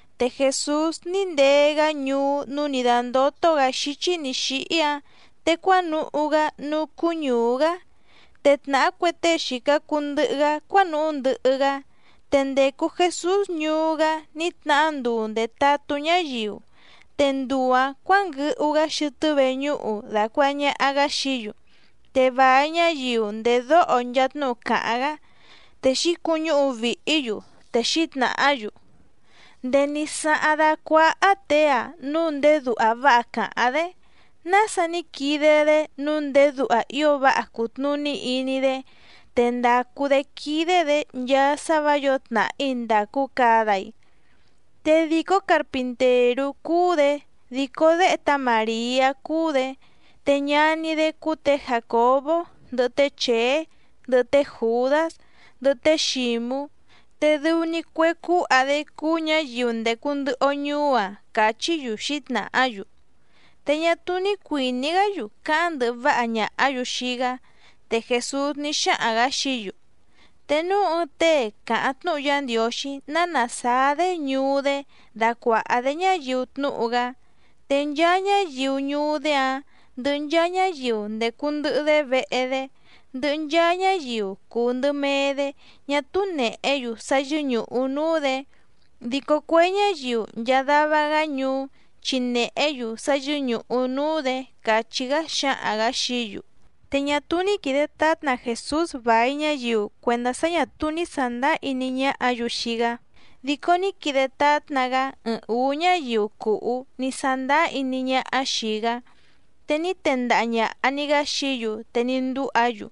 Te Jèsús ní ndee‑gá ñuú núú nǐ dándótó‑gǎ xíchí nǐ xíhí‑áⁿ, te cuánuhú‑gá núú cúú ñùú‑gá, te tnàhá cue tée xìca cuu ndɨhɨ‑gá cuánuhú ndɨhɨ‑gá. Te ndècu Jesús ñuú‑gá ní tnahá nduu ndètatú ñáyiu. Te nduu‑ǎⁿ cuǎnguɨhu‑gá xɨtɨ́ veñúhu dàcuaha ñaha‑gá xií‑yu. Te vài ñáyiu ndèdóho nchaa tnúhu càháⁿ‑gá, te xǐcuñúhu vìhí‑yu, te xǐtnàhá‑yu: —¿Ndèé ní sáháⁿ dácuáhá těe‑a núu ndéé duha váha càháⁿ‑dé, nása ní quide‑dé nǔu ndéé duha ío váha cùtnuní iní‑dé, te ndàcu‑dé quídé‑dě nchaa sá vǎ yǒo tnàhí ndàcu cada‑i? Te dìcó carpintèrú cúú‑dě, dìcó déhe tá Màriá cúú‑dě, te ñaní‑dé cúú tě Jàcobó, ndɨhɨ té Chèé, ndɨhɨ té Jùdás, ndɨhɨ té Xǐmú, te dɨu‑ni cue cúha‑dé cúú ñǎyiu ndècu ndɨhɨ‑o ñuú‑a —càchí‑yu xǐtnàhá‑yu. Te ñá túú ní cuìní‑gá‑yu cáháⁿ ndɨhɨ váha ñàhá‑yu xii‑gá. Te Jèsús ní xáhaⁿ‑gǎ xií‑yu: —Te núu ɨɨⁿ tée càháⁿ tnúhu Yá Ndiǒxí ná nàsáá‑dé ñuú‑dé dacuàha‑dé ñáyiu tnúhu‑gá, te nchaa ñáyiu ñuú‑dé‑áⁿ, ndɨhɨ nchaa ñáyiu ndècu ndɨhɨ‑dé vehe‑dé, ndɨhɨ nchaa ñáyiu cùu ndɨ mee‑dé ñá túú nèhé‑yu sá yɨ́ñùhu núú‑dě, dico cue ñáyiu nchaa dava‑gá ñuú chi nèhé‑yu sá yɨ́ñùhu núú‑dě —càchí‑gá xǎhaⁿ‑gǎ xií‑yu. Te ñá túú ní quìde tátna Jèsús vài ñáyiu cuèndá sá ñà túú ní sàndáá iní ñáhǎ‑yu xii‑gá, dico ní quide tátna‑gá ɨɨⁿ ǔú ñáyiu cùhú ní sándáá iní ñáhá xìi‑gá. Te ní tendaha ñàha‑ni‑gá xií‑yu te ní ndúha‑yu.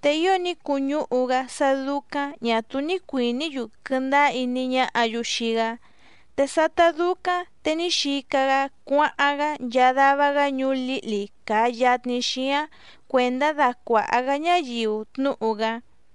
Te ío ní cuñúhu‑gá sá dúcáⁿ ñà túú ní cuìní‑yu quɨndáá iní ñáhǎ‑yu xii‑gá. Te sátá dúcáⁿ te ní xica‑gá cuáháⁿ‑gá nchaa dava‑gá ñuú lǐhli càa yatni xíáⁿ cuèndá dacuàha‑gá ñáyiu tnúhu‑gá.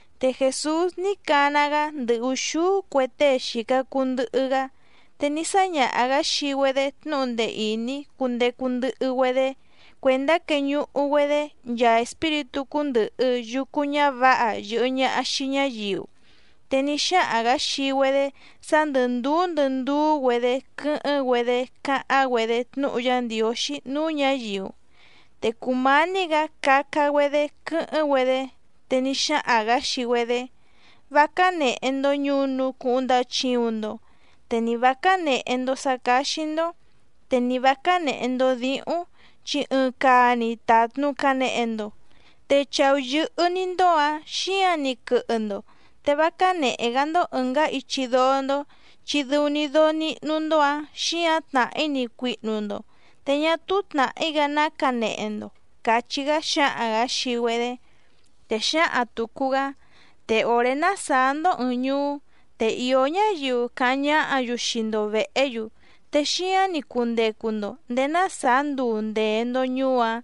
Te Jèsús ní cana‑gá ndɨ ùxúú cue tée xìca cuu ndɨhɨ‑gá, te ní sáñaha‑gǎ xii‑güedé tnúhu ndee ìní cundecu ndɨhɨ‑güedé cuèndá queñuhu‑güedé nchaa espíritú cúndɨ̀hɨ yucu ñávǎha yɨ̀hɨ ñaha xii ñáyiu. Te ní xáhaⁿ‑gǎ xii‑güedé sá ndɨ̀ ndúú ndɨ ndúú‑güedě quɨ́hɨ́ⁿ‑güedé cáháⁿ‑güedé tnúhu Yá Ndiǒxí núú ñǎyiu. Te cùmání‑gǎ caca‑güedé quɨ́hɨ́ⁿ‑güedé, te ni xáhaⁿ‑gǎ xii‑güedé: —Vá cánèhe‑ndo ñunu cuhuⁿ ndachiuⁿ‑ndo, te ni vǎ cánèhe‑ndo sá cáxí‑ndó, te ni vǎ cánèhe‑ndo díhúⁿ, chi ɨɨⁿ caa‑ni tàtnu canehe‑ndo, te chàú yɨ́hɨ́‑ní‑ndó‑ǎⁿ xíǎⁿ‑ni quɨhɨ‑ndo, te vá cánèhe‑gá‑ndó ɨ̀ngá ichi dóó‑ndó chi dɨu‑ni dóó níhnú‑ndó‑ǎⁿ xíǎⁿ tnàhí‑ni cuihnu‑ndo te ñá túú tnàhí‑gá ná canehe‑ndo —càchí‑gá xǎhaⁿ‑gǎ xii‑güedé. Te xǎhaⁿ tùcu‑gá: —Te òré ná sàá‑ndó ɨ̀ɨⁿ ñuú, te ìó ñáyiu cáháⁿ ñáhǎ‑yu xii‑ndo vèhé‑yu, te xíáⁿ‑ni cundecu‑ndo ndèé ná sàá nduu ndèe‑ndo ñuú‑áⁿ.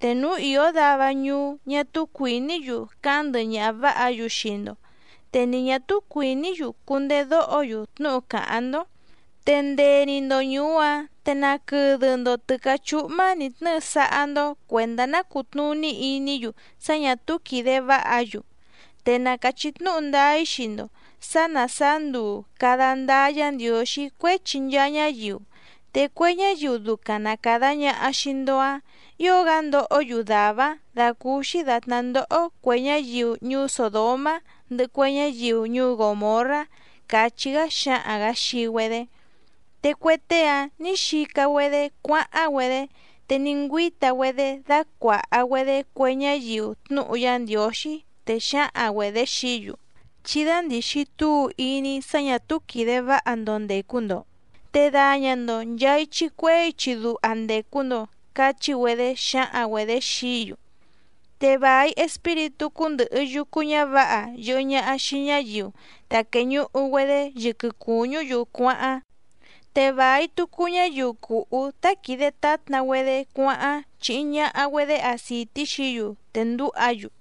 Te núu ìó dava ñuú ñá túú cuìní‑yu cáháⁿ ndɨhɨ ñaha vǎha‑yu xii‑ndo, te ni ñà túú cuìní‑yu cundedóho‑yu tnúhu càháⁿ‑ndó, te ndee‑ni‑ndo ñùú‑áⁿ te naquɨdɨ‑ndo tɨ̀cáchúhmá nǐ tnɨ́ɨ sáhá‑ndó cuèndá ná cùtnuní iní‑yu sá ñà túú quìde váha‑yu. Te na càchí tnúhu ndáá‑í xii‑ndo sǎ ná sàá nduu càda ndáá Yǎ Ndiǒxí cuéchi nchaa ñáyiu, te cue ñáyiu ducaⁿ na càda ñaha xii‑ndo‑áⁿ ǐo‑gá ndohó‑yu dàvá‑áⁿ dàcúúxí dàtná ndoho cue ñáyiu ñuú Sòdomá ndɨhɨ cue ñáyiu ñuú Gòmorrá —càchí‑gá xǎhaⁿ‑gǎ xii‑güedé. Te cue tée‑áⁿ nǐ xica‑güedé cuáháⁿ‑güedé te ní ngüíta‑güedé dácuàha‑güedé cue ñáyiu tnúhu Yá Ndiǒxí, te xǎhaⁿ‑güedě xií‑yu: —Chí dándìxi túu iní sá ñà túú quìde váha‑ndo ndècu‑ndo, te daña‑ndo nchàa ichi cuehé ichi duha ndècu‑ndo. —càchí‑güedé xǎhaⁿ‑güedě xií‑yu. Te vài espíritú cúndɨ̀hɨ yucu ñávǎha yɨ̀hɨ ñaha xii ñáyiu ta quèñuhu‑güedé yɨquɨ cùñú‑yu cuáháⁿ, te vài tucu ñáyiu cùhú tá quìde tátna‑güedé cuáháⁿ chíhí ñàha‑güedé acìtí xií‑yu te ndǔha‑yu.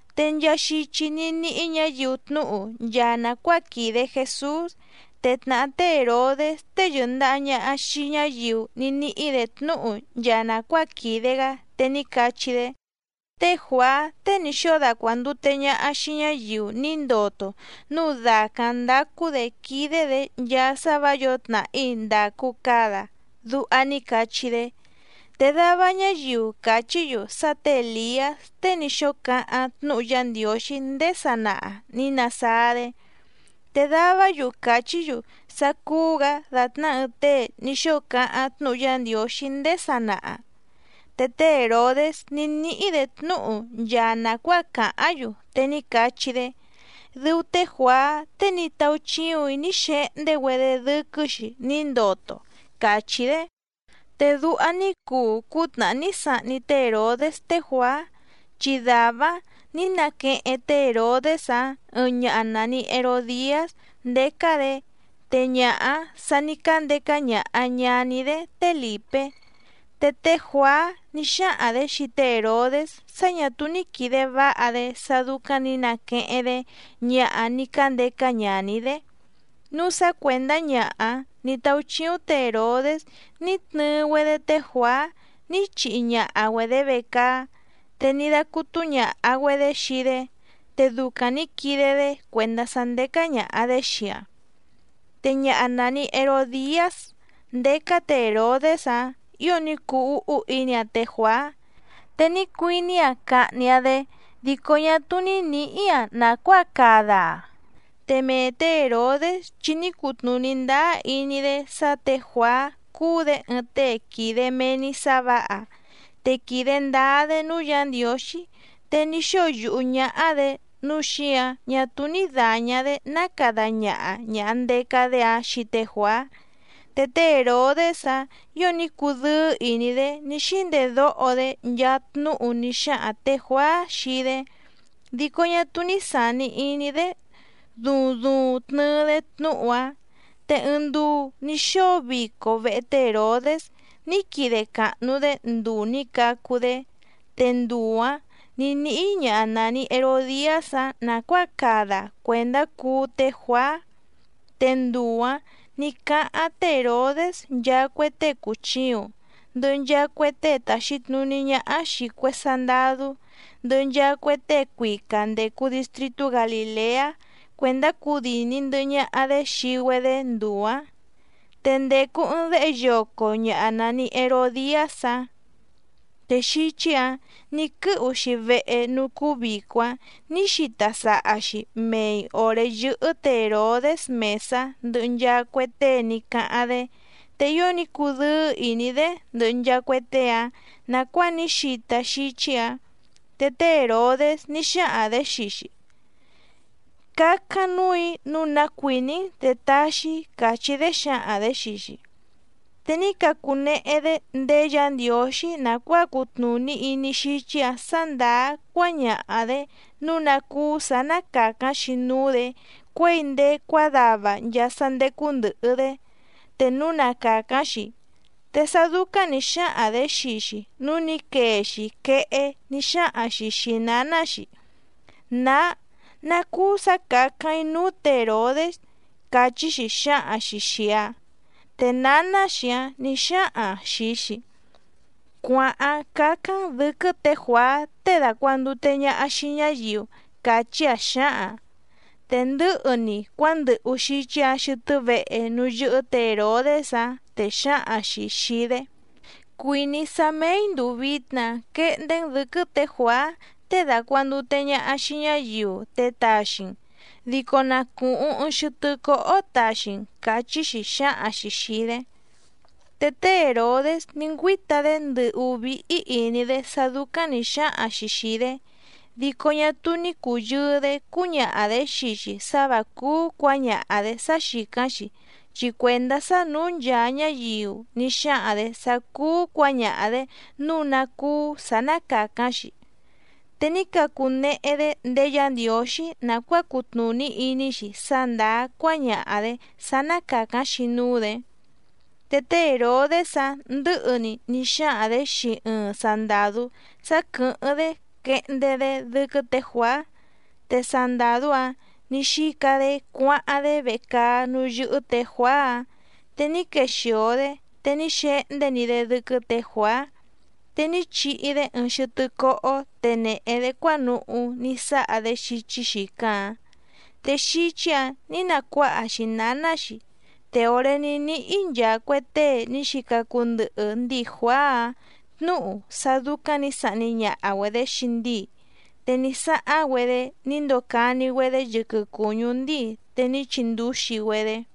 Te nchaa xichi ní níhí ñǎyiu tnúhu nchaa nàcuáa quìde Jesús, te tnàhá té Hèrodés tée yɨ̀ndaha ñaha xii ñáyiu ní níhí‑dě tnúhu nchaa nàcuáa quìde‑gá, te ní cachí‑dé: —Té Juàá tée ní xóo dacuàndute ñaha xii ñáyiu ní ndoto núu dàcáⁿ ndácú‑dě quídé‑dě nchaa sá vǎ yǒo tnàhí ndàcu cada —duha ní cachí‑dé. Te dava ñáyiu càchí‑yu sá tě Èliás tée ní xóo cáháⁿ tnúhu Yá Ndiǒxí ndéé sanaha ní nasáá‑dé. Te davá‑yu càchí‑yu sá cúú‑gǎ dàtná ɨɨⁿ tée ní xóo cáháⁿ tnúhu Yá Ndiǒxí ndéé sanaha. Te té Hèrodés ní níhí‑dě tnúhu nchaa nàcuáa càháⁿ‑yu, te ní cachí‑dé: —Dɨu té Juàá tée ní táúchíùⁿ‑í ní xehndé‑güedé dɨ́quɨ́‑xi ní ndoto —càchí‑dé. Te duha ní cuu cútnàhá ní sahni té Hèrodés té Juàá, chi dàvá‑áⁿ nǐ naqueheⁿ té Hèrodés‑áⁿ ɨɨⁿ ñaha nàni Herodiás ndécá‑dě, te ñaha‑áⁿ sà ní cándeca ñaha ñàní‑dé té Lìpé. Te té Juàá ní xáhaⁿ‑dě xii té Hèrodés sá ñà túú ní quìde váha‑dé sá dúcáⁿ nǐ naqueheⁿ‑dé ñaha ní cándeca ñaní‑dé, núu sá cuèndá ñaha‑áⁿ nǐ táúchíúⁿ tě Hèrodés ní tnɨɨ‑güedé té Juàá ní chihi ñaha‑güedě vecaá, te ní dácútú ñàha‑güedé xii‑dé, te ducaⁿ nǐ quide‑dé cuèndá sá ndécá ñàha‑dé xii‑aⁿ. Te ñaha nàni Herodiás ndécá tě Hèrodés‑áⁿ ǐo ní cuu úhú iní‑aⁿ té Juàá, te ní cuiní‑aⁿ cahni‑aⁿ‑dé, dico ñá túú ní nǐhí‑aⁿ nàcuáa cada‑aⁿ. Te mee tě Hèrodés chi ní cutnùní ndáá iní‑dé sá tě Juàá cúú‑dě ɨɨⁿ tée quìde mee‑ni sá vǎha, te quìde ndáá‑dé núú Yǎ Ndiǒxí, te ní xóo yùhú ñáhá‑dě nǔu xíǎⁿ ñá túú ní dàña‑dé ná cada ñaha ñàha ndeca‑dé‑áⁿ xii té Juàá. Te té Hèrodés‑áⁿ ǐo ní cudɨ́ɨ́ ìní‑dé ní xíndedóho‑dé nchaa tnúhu ní xáhaⁿ tě Juàá xii‑dé, dico ñá túú ní sàni iní‑dé duuⁿ duuⁿ tnɨɨ‑dé tnúhu‑áⁿ. Te ɨɨⁿ nduu ní xóo vico vehe té Hèrodés ní quide càhnu‑dé nduu nǐ cacu‑dé. Te nduu‑ǎⁿ nǐ níhí ñaha nàni Herodiás‑áⁿ nàcuáa cada‑aⁿ cuèndá cuú té Juàá. Te nduu‑ǎⁿ ní cáháⁿ té Hèrodés nchaa cue tée cùchiuⁿ, ndɨhɨ nchaa cue tée tàxi tnuní ñáhá xìi cue sandadú, ndɨhɨ nchaa cue tée cuica ndècu distritú Galìleá cuèndá cudìni ndɨhɨ ñaha‑dé xii‑güedé nduu‑ǎⁿ. Te ndècu ɨɨⁿ déhe yoco ñàha nani Herodiás‑áⁿ, te xíchí‑ǎⁿ nǐ quɨ́hu‑xi vehe núú cúú vìco‑áⁿ nǐ xita saha‑xi mèi oré yɨ́hɨ́ tě Hèrodés mèsá ndɨhɨ nchaa cue tée ní cáháⁿ‑dé, te ío ní cudɨ́ɨ́ ìní‑dé ndɨhɨ nchaa cue tée‑áⁿ nàcuáa ní xita xíchí‑ǎⁿ. Te té Hèrodés ní xáhaⁿ‑dě xii‑xi: —Cácáⁿ núù‑í nǔu ná cuìní‑n te taxi‑í —càchí‑dé xǎhaⁿ‑dě xii‑xi. Te ní cacunehe‑dé ndéé Yǎ Ndiǒxí nàcuáa cutnùní iní xíchí‑ǎⁿ sǎ ndàá cuáñaha‑dě nǔu ná cúú sǎ ná càcáⁿ‑xi núú‑dě cuěi ndéé cuádava nchaa sá ndécú ndɨ̀hɨ‑dé, te núu na càcáⁿ‑xi. Te sá dúcáⁿ nǐ xáhaⁿ‑dě xii‑xi núu ní quee‑xi quehé ní xáhaⁿ‑xi xìi náná‑xi: —Nǎá, ¿ná cúú sǎ càcáⁿ‑í núú tě Hèrodés? —càchí‑xi xǎhaⁿ‑xi xìi‑aⁿ. Te nǎná‑xi‑áⁿ nǐ xáhaⁿ‑aⁿ xìi‑xi: —Cuàháⁿ cácáⁿ‑n dɨ̌quɨ́ tě Juàá tée dàcuandute ñaha xii ñáyiu —càchí‑aⁿ xǎhaⁿ‑aⁿ. Te ndɨ̌hɨ‑ni cuándɨhu xíchí‑ǎⁿ xɨtɨ́ vehe núú yɨ́hɨ́ tě Hèrodés‑áⁿ, te xǎhaⁿ‑xi xìi‑dé: —Cuìní‑í sá mèi nduu vitna quehndé‑n dɨ̌quɨ́ tě Juàá tée dàcuandute ñaha xii ñáyiu te taxi‑n, dico na cùhuⁿ ɨɨⁿ xɨtɨ́ cóhó taxi‑n —càchí‑xi xǎhaⁿ‑xi xìi‑dé. Te té Hèrodés ní ngüíta‑dé ndɨ̀hú víhí ìní‑dé sá dúcáⁿ nǐ xáhaⁿ‑xi xìi‑dé, dico ñá túú ní cùyɨɨ‑dé cúñaha‑dě xii‑xi sá vǎ cúú cuǎñaha‑dě sá xìcáⁿ‑xi, chi cuèndá sá nǔú nchaa ñáyiu ní xáhaⁿ‑dě sá cúú cuǎñaha‑dě nǔu ná cúú sǎ ná càcáⁿ‑xi, te ní cacunehe‑dé ndéé Yǎ Ndiǒxí nàcuáa cutnùní iní‑xi sá ndàá cuáñaha‑dě sá ná càcáⁿ‑xi núú‑dě. Te té Hèrodés‑áⁿ ndɨ̌hɨ‑ni ní xáhaⁿ‑dě xii ɨɨⁿ sandàdú sá quɨ̀hɨ́ⁿ‑dé quehndé‑dé dɨ́quɨ́ tě Juàá. Te sandàdú‑áⁿ nǐ xica‑dé cuáháⁿ‑dé vecaá núú yɨ́hɨ́ tě Juàá‑áⁿ, te ní quexìo‑dé te ní xehndé‑ni‑dé dɨ́quɨ́ tě Juàá, te ní chihi‑dé ɨɨⁿ xɨtɨ́ cóhó te nèhe‑dé cuánuhú ní sáha‑dé xíchí xìcáⁿ‑áⁿ, te xíchí‑ǎⁿ nǐ nacuáha‑xi nǎná‑xi. Te òré ní níhí nchaa cue tée ní xica cuu ndɨhɨ ndíi Juàá‑áⁿ tnǔhu sá dúcáⁿ nǐ sahni ñaha‑güedě xii ndíi, te ní sáháⁿ‑güedé ní ndocani‑güedé yɨquɨ cùñú ndíi te ní chindúxi‑güedé.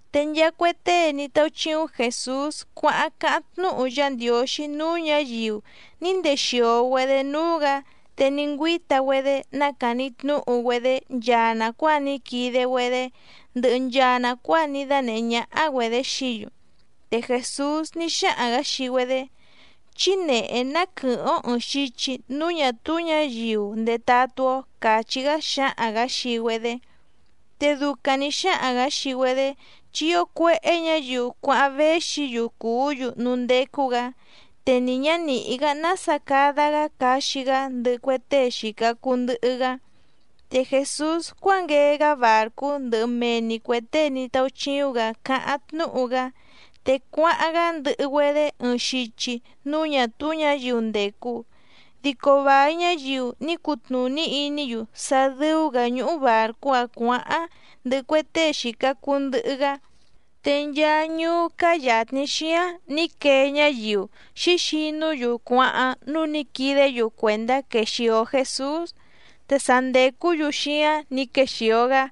Te nchaa cue tée ní táúchíúⁿ Jèsús cuáháⁿ cáháⁿ tnúhu Yá Ndiǒxí núú ñǎyiu ní ndexìo‑güedé núú‑gǎ te ní ngüíta‑güedé nácàni tnúhu‑güedé nchaa nàcuáa ní quide‑güedé ndɨhɨ nchaa nàcuáa ní dánèhé ñáhá‑güedě xií‑yu. Te Jèsús ní xáhaⁿ‑gǎ xii‑güedé: —Chí nèhé ná quɨ̀hɨ́ⁿ‑ó ɨ̀ɨⁿ xichi núú ñà túú ñǎyiu ndetatú‑ó —càchí‑gá xǎhaⁿ‑gǎ xii‑güedé. Te ducaⁿ nǐ xáhaⁿ‑gǎ xii‑güedé, chi ío cuéhé ñǎyiu cuáháⁿ véxi‑yu cùú‑yu núú ndécú‑gǎ. Te ni ñǎ nìhí‑gá nása cada‑gá caxi‑gá ndɨhɨ cue tée xìca cuu ndɨhɨ‑gá. Te Jèsús cuánguee‑gá bàrcú ndɨhɨ mee‑ni cuè tée ní táúchíúⁿ‑gǎ cáháⁿ tnúhu‑gá, te cuáháⁿ‑gá ndɨhɨ‑güedé ɨɨⁿ xichi núú ñà túú ñǎyiu ndècu. Dico vài ñáyiu ní cutnùní iní‑yu sá dɨ́ú‑gǎ ñúhú bàrcú‑áⁿ cuǎháⁿ ndɨhɨ cue tée xìca cuu ndɨhɨ‑gá, te nchaa ñuú cáá yàtni xíáⁿ nǐ quee ñáyiu xǐxinú‑yu cuáháⁿ núú nǐ quidé‑yu cuèndá quexìo Jesús, te sa ndècú‑yu xíáⁿ nǐ quexìo‑gá.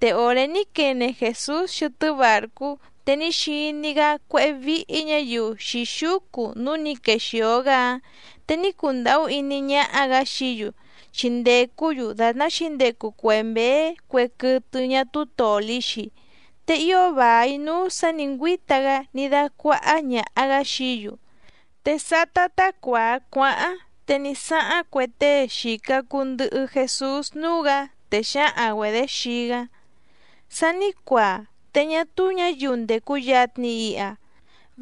Te òré ní quene Jèsús xɨtɨ́ bàrcú, te ní xiní‑gá cuéhé víhí ñǎyiu xǐxúcu núú nǐ quexìo‑gá‑áⁿ, te ní cundàhú iní ñáhá‑gǎ xií‑yu chi ndècú‑yu dàtná xǐndecu cue mběé cue quɨtɨ ñá túú tòli‑xi, te ío vài núú sǎ nǐ ngüíta‑gá ní dácuáhá ñàha‑gá xií‑yu. Te sátá tá cuàa cuáháⁿ te ní sáháⁿ cue tée xìca cuu ndɨhɨ Jesús núú‑gǎ, te xǎhaⁿ‑güedě xii‑gá: —Sa ní cuaa te ñá túú ñǎyiu ndècu yatni iha.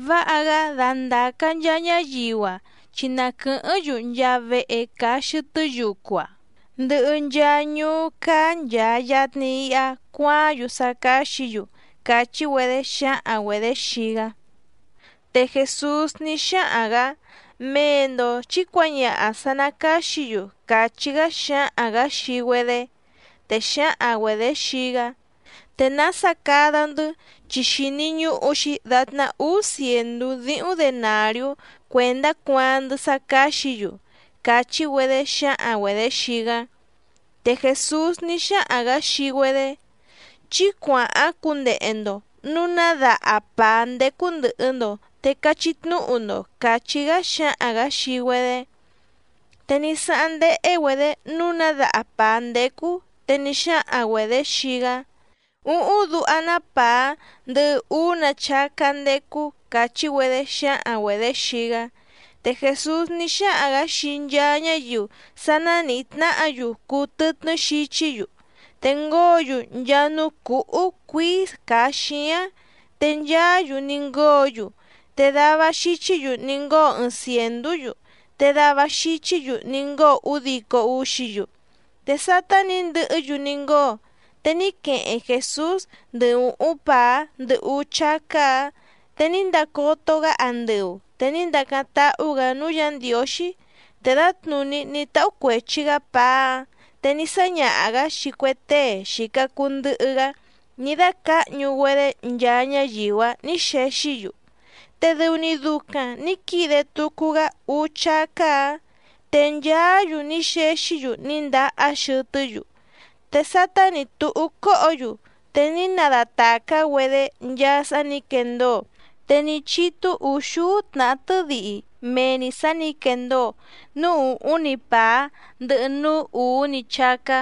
Váha‑gá dandàca nchaa ñáyiu‑a chi na quɨ̀hɨ́ⁿ‑yu nchaa vehe càa xɨtɨ́ yucu‑a, ndɨhɨ nchaa ñuú cáá nchàa yatni iha cuaáⁿ‑yu sá cáxǐ‑yu —càchí‑güedé xǎhaⁿ‑güedě xii‑gá. Te Jèsús ní xáhaⁿ‑gǎ: —Mee‑ndo chǐ cuǎñaha sǎ ná càxí‑yu —càchí‑gá xǎhaⁿ‑gǎ xii‑güedé. Te xǎhaⁿ‑güedě xii‑gá: —¿Te nása cada‑ndɨ́, chi xìni ñuhu‑xi datná úú cièndú díhúⁿ denàriú cuèndá cuaaⁿ‑ndɨ́ sá cáxǐ‑yu? —càchí‑güedé xǎhaⁿ‑güedě xii‑gá. Te Jèsús ní xáhaⁿ‑gǎ xii‑güedé: —Chí cuàháⁿ cundehe‑ndo nǔu ná daha pàá ndécú ndɨ̀hɨ‑ndo te cachí tnúhu‑ndo —càchí‑gá xǎhaⁿ‑gǎ xii‑güedé. Te ní sáháⁿ ndéhé‑güedě nǔu ná daha pàá ndécú, te ní xáhaⁿ‑güedě xii‑gá: —Úhúⁿ duha‑ná pàá ndɨhɨ úú‑nǎ chácá ndécú —càchí‑güedé xǎhaⁿ‑güedě xii‑gá. Te Jèsús ní xáhaⁿ‑gǎ xii nchaa ñáyiu sá ná nìhí tnáhǎ‑yu cuu tɨtnɨ́ xichí‑yu, te ngóo‑yu nchaa núú cǔhú cuíí càa xíáⁿ. Te nchaá‑yu ní ngóo‑yu, te dava xichí‑yu ní ngóo ɨɨⁿ cièndú‑yu, te dava xichí‑yu ní ngóo údico úxí‑yu. Te sátá nǐ ndɨhɨ́‑yu ní ngóo, te ní queheⁿ Jèsús ndɨ ùhúⁿ pàá ndɨ úú chácá‑ǎⁿ, te ní ndacoto‑gá andɨu te ní ndacáⁿ táhú‑gǎ núú Yǎ Ndiǒxí, te dǎtnùní ní táhú cuèchi‑gá pàá‑áⁿ te ní sáñaha‑gǎ xii cue tée xìca cuu ndɨhɨ‑gá ní dácǎhñu‑güedé nchaa ñáyiu‑áⁿ nǐ xexí‑yu. Te dɨu‑ni ducaⁿ nǐ quide tucu‑gá úú chácá‑ǎⁿ. Te nchaá‑yu ní xexí‑yu ní ndahá xɨtɨ́‑yu. Te sátá nǐ túhú cóhǒ‑yu te ní nadatàcá‑güedé nchaa sá nǐ quendóo, te ní chítú ùxúú tnàhá tɨ́dihi mee‑ni sǎ nǐ quendóo núú ùhúⁿ‑ni pàá, ndɨhɨ núú ùú‑ni chácá.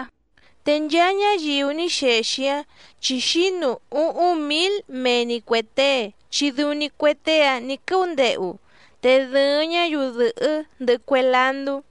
Te nchaa ñáyiu ní xexi‑áⁿ chi xǐnu úhúⁿ mǐl mee‑ni cuè tée chi dɨu‑ni cue tée‑áⁿ nǐ quɨ́úndehu, te dɨ̀ɨⁿ ñáyiu dɨ̀hɨ́ ndɨhɨ cue landú.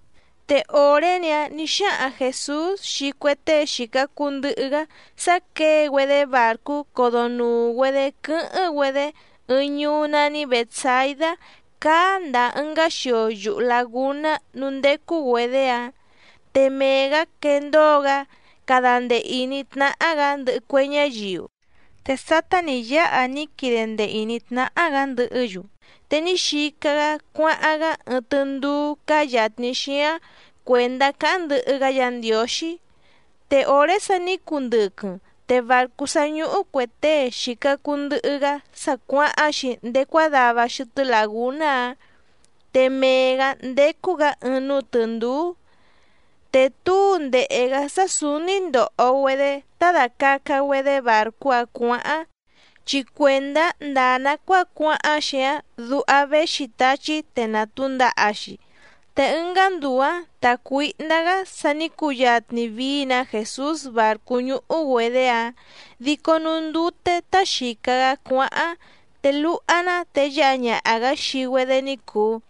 Te òré‑ni‑áⁿ nǐ xáhaⁿ Jèsús xii cue tée xìca cuu ndɨhɨ‑gá sá quěe‑güedé bàrcú codonùu‑güedé quɨ́hɨ́ⁿ‑güedé ɨɨⁿ ñuú nání Bètsaidá cáá ndàa ɨngá xio yuhu làgúná núú ndécú‑güedě‑áⁿ, te mee‑gǎ quendóo‑gá cada ndee ìní tnáhá‑gǎ ndɨhɨ cue ñáyiu. Te sátá nǐ yáha ní quide ndee ìní tnáhá‑gǎ ndɨhɨ́‑yu, te ní xica‑gá cuáháⁿ‑gá ɨɨⁿ tɨndúú cáá yàtni xíáⁿ cuèndá cáháⁿ ndɨhɨ‑gá Yǎ Ndiǒxí. Te òré sa ní cundɨquɨⁿ te bàrcú sá ñúhú cuè tée xìca cuu ndɨhɨ‑gá sa cuáháⁿ‑xi ndéé cuádava xɨtɨ́ làgúná‑áⁿ, te mee‑gǎ ndécú‑gǎ ɨɨⁿ núú tɨ̀ndúú. Te túu ndèhe‑gá sá sǔúní ndòho‑güedé tá dàcaca‑güedé bàrcú‑áⁿ cuǎháⁿ, chi cuèndá ndàa nacuáa cuáháⁿ‑xi‑áⁿ duha véxi táchí te nàtúndaha‑xi. Te ɨngá nduu‑ǎⁿ tàcuíhndá‑gá sa ní cuyatni vií‑nǎ Jèsús bàrcú ñúhú‑güedě‑áⁿ, dico núú ndute tá xìca‑gá cuáháⁿ te luha‑ná te yáha ñaha‑gǎ xii‑güedé ní cùu.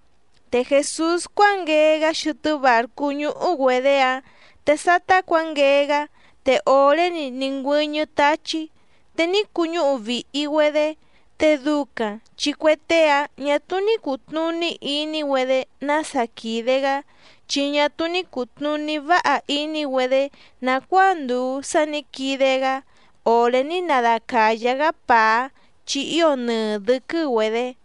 Te Jèsús cuánguee‑gá xɨtɨ́ bàrcú ñúhú‑güedě‑áⁿ, te sátá cuǎnguee‑gá te òré‑ni ní ngüɨ́ñɨ́ táchí, te ní cuñúhu vìhi‑güedé. Te ducaⁿ chi cue tée‑áⁿ ñà túú ní cùtnuní iní‑güedé nása quìde‑gá, chi ñá túú ní cùtnuní váha iní‑güedé nàcuáa ndùu sá nǐ quide‑gá òré ní nadacàyá‑gá pàá, chi ío nɨɨ dɨ̌quɨ́‑güedě.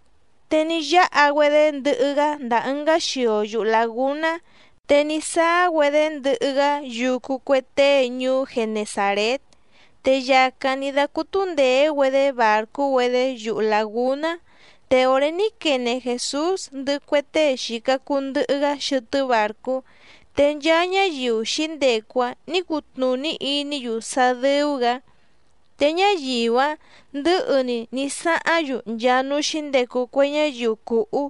Te ní yáha‑güedé ndɨhɨ‑gá ndàa ɨngá xio yuhu làgúná, te ní sáá‑güedé ndɨhɨ‑gá yucu cue tée ñuú Genesàrét. Te yàcáⁿ ní dácútú ndèé‑güedé bàrcú‑güedé yuhu làgúná. Te òré ní quene Jèsús ndɨhɨ cue tée xìca cuu ndɨhɨ‑gá xɨtɨ́ bàrcú, te nchaa ñáyiu xǐndecu‑áⁿ nǐ cutnùní iní‑yu sá dɨ́ú‑gǎ. Te ñáyiu‑áⁿ ndɨ̌hɨ‑ni ní sáháⁿ‑yu nchaa núú xǐndecu cue ñáyiu cùhú,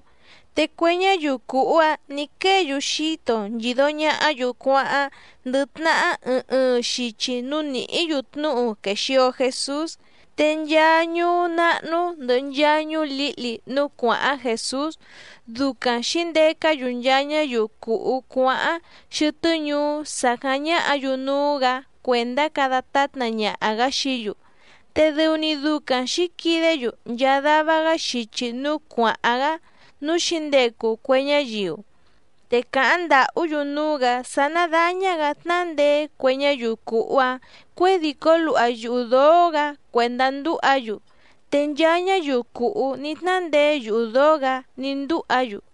te cue ñáyiu cùhú‑áⁿ nǐ quée‑yu xíto nchìdo ñahá‑yu cuáháⁿ ndɨ tnahá ɨɨⁿ ɨɨⁿ xichi núú nìhí‑yu tnúhu quèxio Jesús. Te nchaa ñuú náhnú ndɨ̀hɨ nchaa ñuú lǐhli núú cuàháⁿ Jèsús, ducaⁿ xǐndecá‑yu nchaa ñáyiu cùhú cuáháⁿ xɨtɨ́ ñuú sàcáⁿ ñáhǎ‑yu núú‑gǎ cuèndá cada tátna ñaha‑gǎ xií‑yu. Te dɨu‑ni ducaⁿ xǐquidé‑yu nchaa dava‑gá xichi núú cuàháⁿ‑gá núú xǐndecu cue ñáyiu, te càháⁿ ndàhú‑yu núú‑gǎ sá ná dáñá‑gǎ tnándeé cue ñáyiu cùhú‑áⁿ cuědìcó luha yuhu dǒó‑gǎ cuèndá ndúha‑yu. Te nchaa ñáyiu cùhú ní tnándeé yuhu dǒó‑gǎ ní ndúha‑yu.